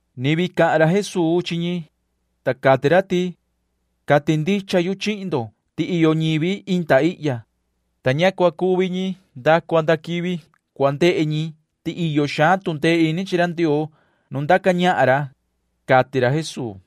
Ni vii cahan ra Jesuu chi ñi, ta cati ra ti: ―Cati ndicha yu chihin ndo ti iyo ñivi inda ihya, ta ña cua cuvi ñi nda cua nda quivi cua ndehe ñi ti iyo xaan tu ndee ini chi ra Ndioo nu ndaca ñahan ra ―cati ra Jesuu.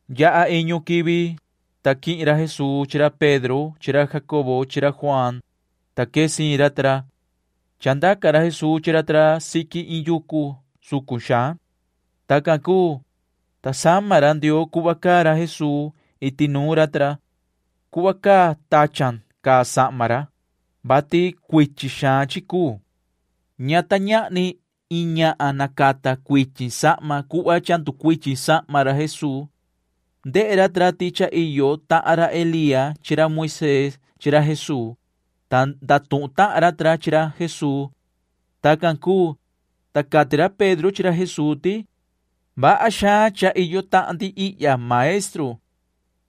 Yaha iñu quivi, ta quihin ra Jesuu chi ra Pedro chi ra Jacobo chi ra Juaan, ta quee siin ra ta ra. Chandaca ra Jesuu chi ra ta ra siqui iin yucu sucun xaan. Tacan cuu, ta sama ra Ndioo cuhva caa ra Jesuu iti nuun ra ta ra. Cuhva caa tachan caa sahma ra, vati cuichin xaan chi cuu. Ña ta ñahni iin ñahan nacata cuichin sahma cuhva cha nducuichin sahma ra Jesuu. Ndehe ra ta ra ti cha iyo tahan ra Elía chi ra Moisee chi ra Jesuu, ta ndatuhun tahan ra ta ra chi ra Jesuu. Tacan cuu, ta cati ra Pedro chi ra Jesuu ti: ―Vaha xaan cha iyo tahan ndi ihya, maestru.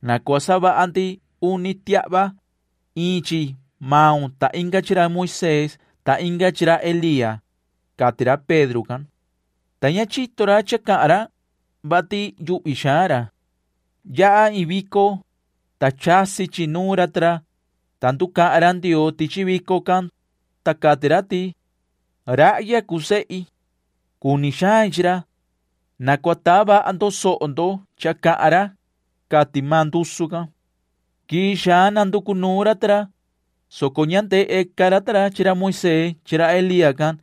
Na cua savaha ndi uni tiahva―iin chi maun ta inga chi ra Moisee ta inga chi ra Elía ―cati ra Pedro can. Ta ña chito ra cha cahan ra, vati yuhvi xaan ra. Yaha iin vico, ta chasi chi nuun ra ta ra, ta nducahan ra Ndioo tichi vico can, ta cati ra ti: ―Rahya cuu sehi. Cuni xain chi ra. Na cua taa vaha ndo soho ndo cha cahan ra ―cati maan ndusu can. Quii xaan nanducu nuun ra ta ra, soco ña ndehe ca ra ta ra chi ra Moisee chi ra Elía can.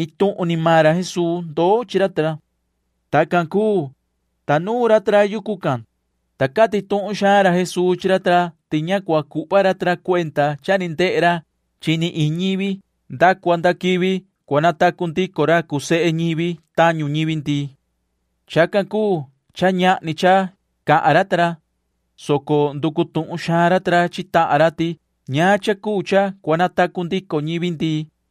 Iin tuhun ni maan ra Jesuu ndoo chi ra ta ra. Tacan cuu, ta nuun ra ta ra yucu can, ta cati tuhun xaan ra Jesuu chi ra ta ra ti ña cua cuhva ra ta ra cuenda cha ni ndehe ra chi ni iin ñivi nda cua nda quivi cua natacu ndico ra cuu sehe ñivi tañu ñivi ndii. Chacan cuu cha ñahni cha cahan ra ta ra, soco nducu tuhun xaan ra ta ra chi tahan ra ti ñaan cha cuu cha cua natacu ndico ñivi ndii,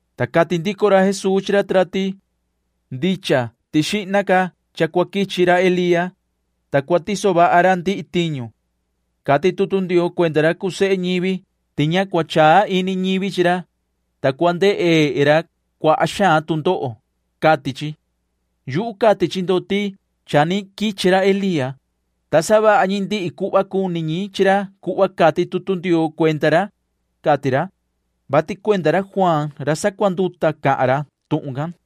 Ta cati ndico ra chi ra ta ra ti: ―Ndicha ti xihna ca cha cua quichi ra Elía, ta cua tiso vaha ra ndihi tiñu. Cati tutu Ndioo cuenda ra cuu sehe ñivi ti ña cua chaa ini ñivi chi ra, ta cua ndehe ra cuaha xaan tu ndoho, cati chi. Yuhu cati chi ndo ti cha ni quichi ra Elía, ta savaha ñi ndihi cuhva cuni ñi chi ra cuhva cati tutu Ndioo cuenda ra ―cati ra, [vati cuenda ra Juaan ra sacuanduta cahan ra tuhun can].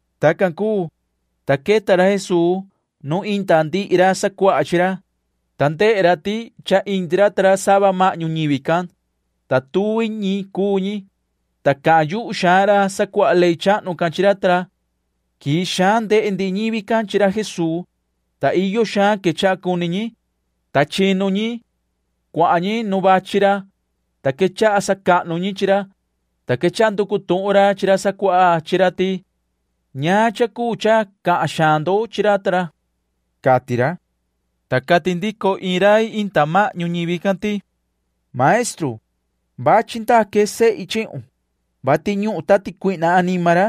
Tacan cuu, ta queta ra Jesuu nuun inda ndihi ra sacuaha chi ra, ta ndehe ra ti cha indi ra ta ra sava mahñu ñivi can, ta tuvi ñi cuu ñi, ta cahan yuhu xaan ra sacuaha ley chahnu can chi ra ta ra. Quii xaan ndehe ndihi ñivi can chi ra Jesuu, ta iyo xaan quechaha cuni ñi, ta chinu ñi. Cuahan ñi nu vachi ra, ta quechaha sacahnu ñi chi ra, ta quechaha nducu tuhun ra chi ra sacuaha chi ra ti: ―¿Ñaan cha cuu cha cahan xaan ndo chi ra ta ra? ―cati ra. Ta cati ndico iin rai indi mahñu ñivi can ti: ―Maestru, vachi ndaque sehi chihun, vati ñuhun tati cuihna anima ra,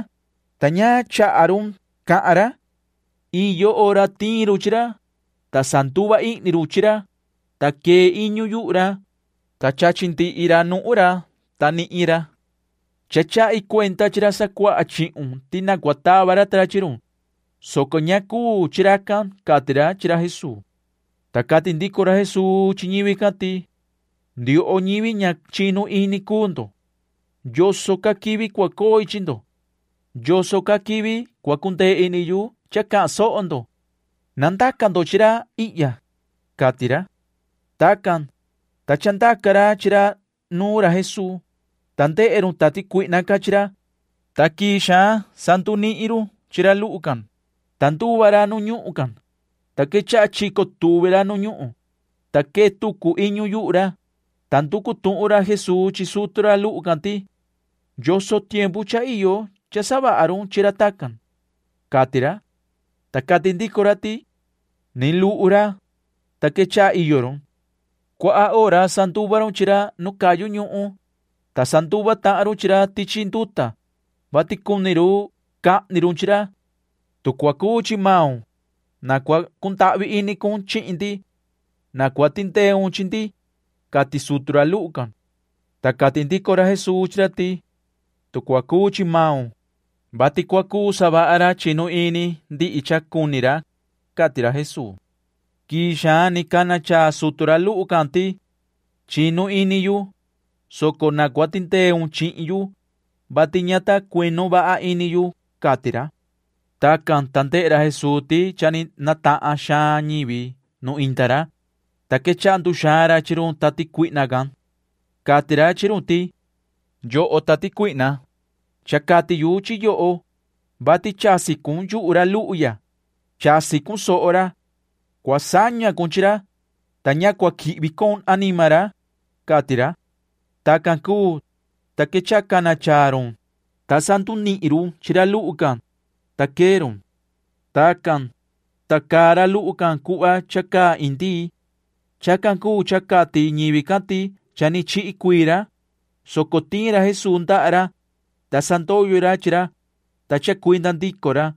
ta ña chaha run cahan ra. Iyo hora tiin run chi ra, ta sanduva ihni run chi ra, ta quee iñu yuhu ra, ta chachi ndihi nuhun ra, ta ndunihin ra. Cha chahi cuenda chi ra sacuaha chihun ti na cua tava ra ta ra chi run, soco ña cuu chi racan ―cati ra chi ra Jesuu. Ta cati ndico ra Jesuu chi ñivi can ti: ―Ndioho ñivi ña chinu ini cuu ndo. ¿Yoso ca quivi cua coi chi ndo? ¿Yoso ca quivi cua cundee ini yu cha cahan soho ndo? Na ndaca ndo chi ra ihya ―cati ra. Tacan, ta chandaca ra chi ra nuun ra Jesuu, ta ndehe run tati cuihna can chi ra, ta quii xaan sandunihin run chi ra luhu can, ta nduva ra nu ñuhun can, ta quechaha chico tuvi ra nu ñuhun, ta quee tucu iñu yuhu ra, ta nducu tuhun ra Jesuu chi sutu ra luhu can ti: ―¿Yoso tiempu cha iyo cha savaha run chi ra tacan? ―cati ra. Ta cati ndico ra ti: ―Ni luhu ra, ta quechaha iyo run. Cuaha hora sanduva run chi ra nu cayu ñuhun, ta sanduva tahan run chi ra tichi nduta, vati cuni run cahni run chi ra. Tu cua cuu chi maun, na cua cundahvi ini cun chihin ndi. Na cua tindeun chi ndi ―cati sutu ra luhu can. Ta cati ndico ra Jesuu chi ra ti: ―Tu cua cuu chi maun, vati cua cuu savaha ra chinu ini ndihi cha cuni ra ―cati ra Jesuu. Quii xaan ni cana chaa sutu ra luhu can ti: ―Chinu ini yu, soco na cua tindeun chihin yu, vati ña ta cuinu vaha ini yu ―cati ra. Tacan, ta ndehe ra Jesuu ti cha ni natahan xaan ñivi nu inda ra, ta quechaha nduxaan ra chi run tati cuihna can. Cati ra chi run ti: ―Yoho tati cuihna, cha cati yu chi yoho, vati chasi cun yuhu ra luhu ya. Chasi cun soho ra. Cua saña cun chi ra, ta ña cua quihvi con anima ra ―cati ra. Tacan cuu, ta quechaha cana chaa run, ta sandunihin run chi ra luhu can, ta quee run. Tacan, ta caa ra luhu can cuhva cha caa iin ndii. Chacan cuu cha cati ñivi can ti cha ni chihi cuii ra, soco tiin ra Jesuu ndaha ra, ta sandoyo ra chi ra, ta chacuinda ndico ra.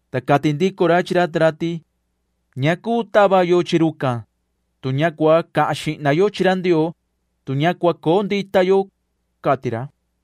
Ta cati ndico ra chi ra ta ra ti: ―Ña cuu tava yo chi rucan, tu ña cua cahan xihna yo chi ra Ndioo, tu ña cua coo ndita yo ―cati ra.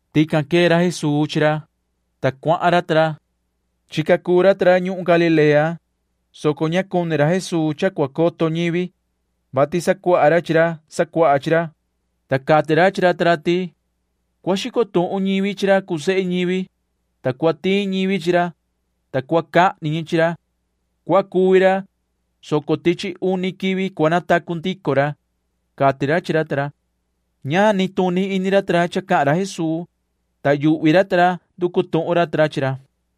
Tican quee ra Jesuu chi ra, ta cuahan ra ta ra. Chica cuu ra ta ra ñuhun Galilea, soco ña cuni ra Jesuu cha cua coto ñivi, vati sacuaha ra chi ra sacuaha chi ra, ta cati ra chi ra ta ra ti: ―Cua xico tuhun ñivi chi ra cuu sehe ñivi, ta cua tiin ñivi chi ra, ta cua cahni ñi chi ra. Cua cuvi ra, soco tichi uni quivi cua natacu ndico ra ―cati ra chi ra ta ra. Ña nituni ini ra ta ra cha cahan ra Jesuu, ta yuhvi ra ta ra nducu tuhun ra chi ra.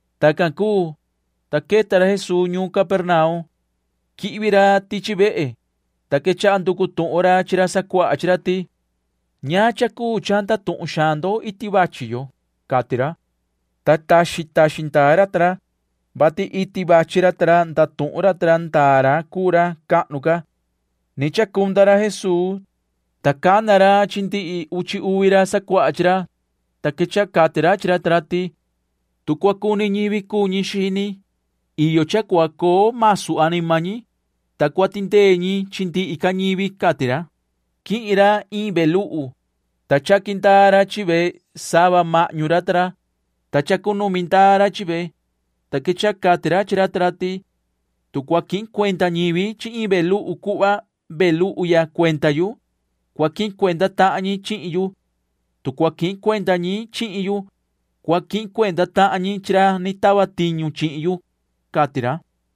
Tacan cuu, ta queta ra Jesuu ñuun Capernaum. Quihvi ra tichi vehe, ta quechaha nducu tuhun ra chi ra sacuaha chi ra ti: ―¿Ñaan cha cuu cha ndatuhun xaan ndo iti vachi yo? ―cati ra. Ta taxin taxin ndaa ra ta ra, vati iti vachi ra ta ra ndatuhun ra ta ra ndaa ra cuu ra cahnu ca. Ni chacunda ra Jesuu, ta cana ra chi ndihi uchi uvi ra sacuaha chi ra, ta quechaha cati ra chi ra ta ra ti: ―Tu cua cuni ñivi cuu ñi xini, iyo cha cua coo masu anima ñi, ta cua tindee ñi chi ndihi ca ñivi ―cati ra. Quihin ra iin ve luhu, ta chaqui ndaa ra chi ve sava mahñu ra ta ra, ta chacunumi ndaa ra chi ve, ta quechaha cati ra chi ra ta ra ti: ―Tu cua quihin cuenda ñivi chi iin ve luhu cuhva ve luhu ya cuenda yu, cua quihin cuenda tahan ñi chihin yu. Tu cua quihin cuenda ñi chihin yu, cua quihin cuenda tahan ñi chi ra ni tava tiñu chihin yu ―cati ra.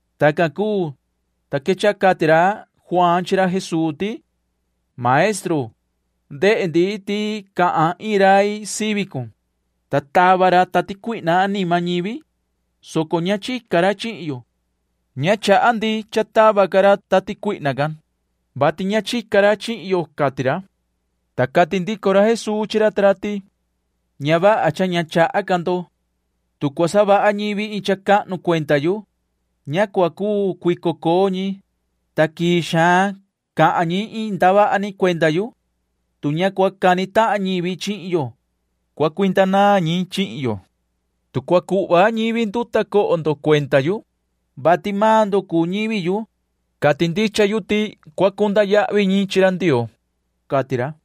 Tacan cuu, ta quechaha cati ra Juaan chi ra Jesuu ti: ―Maestru, ndehe ndi ti cahan iin rai sivi cun, ta tava ra tati cuihna anima ñivi, soco ña chica ra chihin yo. Ña chaha ndi cha tava ca ra tati cuihna can, vati ña chica ra chihin yo ―cati ra. Ta cati ndico ra Jesuu chi ra ta ra ti: ―Ña vaha cha ña chaha ca ndo. Tu cua savaha ñivi iin cha cahnu cuenda yu, ña cua cuu cuico coo ñi, ta quii xaan cahan ñi iin ndavaha ni cuenda yu. Tu ña cua cani tahan ñivi chihin yo, cua cuinda naan ñi chihin yo. Tu cua cuhva ñivi nduta coho ndo cuenda yu, vati maan ndo cuu ñivi yu, cati ndicha yu ti cua cunda yahvi ñi chi ra Ndioo ―cati ra.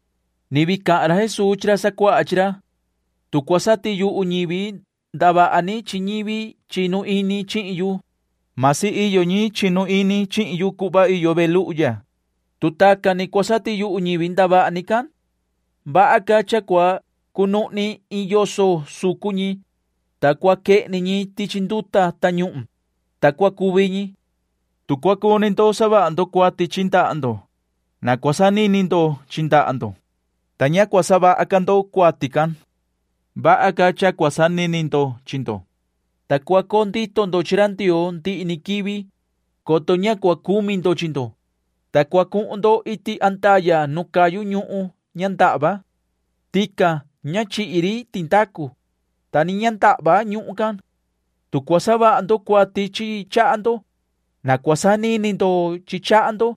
[Ni vii cahan ra Jesuu chi ra sacuaha chi ra:] ’Tu cua satiyuhu ñivi ndavaha ni chi ñivi chinu ini chihin yu―masi iyo ñi chinu ini chihin yu cuhva iyo ve luhu ya, tu tacan ni cua satiyuhu ñivi ndavaha ni can, vaha ca cha cua cunuhni iin yoso sucun ñi, ta cua quehni ñi tichi nduta tañuhun, ta cua cuvi ñi. Tu cua cuni ndo savaha ndo cuati chi ndaha ndo, na cua sanini ndo chi ndaha ndo, ta ña cua savaha ca ndo cuati can. Vaha ca cha cua sanini ndo chi ndo, ta cua coo ndito ndo chi ra Ndioo ndihi ni quivi, coto ña cua cumi ndo chi ndo, ta cua cuhun ndo iti andaya nu cayu ñuhun ña ndahva. Tican ña chihi ri tindacu, ta ni ña ndahva ñuhun can. Tu cua savaha ndo cuati chi chaha ndo, na cua sanini ndo chi chaha ndo,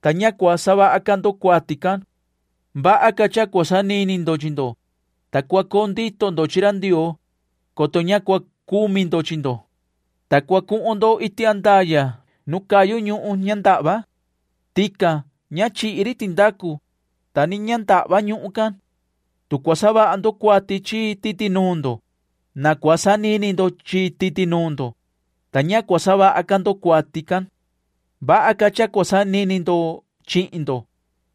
ta ña cua savaha ca ndo cuati can. Vaha ca cha cua sanini ndo chi ndo, ta cua coo ndito ndo chi ra Ndioo, coto ña cua cumi ndo chi ndo, ta cua cuhun ndo iti andaya nu cayu ñuhun ña ndahva. Tican ña chihi ri tindacu, ta ni ña ndahva ñuhun can. Tu cua savaha ndo cuati chi titi nuun ndo, na cua sanini ndo chi titi nuun ndo, ta ña cua savaha ca ndo cuati can. Vaha ca cha cua sanini ndo chihin ndo,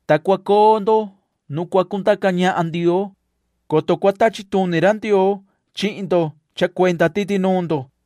ta cua coo ndo nu cua cundaca ñahan Ndioo, coto cua tachi tuni ra Ndioo chihin ndo cha cuenda titi nuun ndo,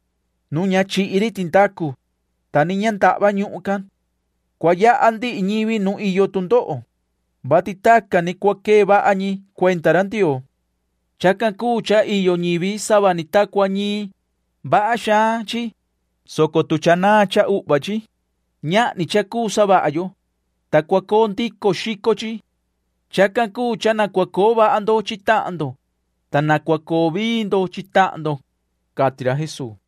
nuun ña chihi ri tindacu, ta ni ña ndahva ñuhun can. ’Cua yaha ndihi ñivi nu iyo tu ndoho, [vati tacan ni cua quee vaha ñi cuenda ra Ndioo. Chacan cuu cha iyo ñivi sava ni ta cua iyo ñiin.] Vaha xaan chi, soco tu cha naan cha uhva chi, ñahni cha cuu savaha yo, ta cua coo ndico xico chi. Chacan cuu cha na cua coo vaha ndo chihin tahan ndo, ta na cua coo vii ndo chi tahan ndo ―cati ra Jesuu.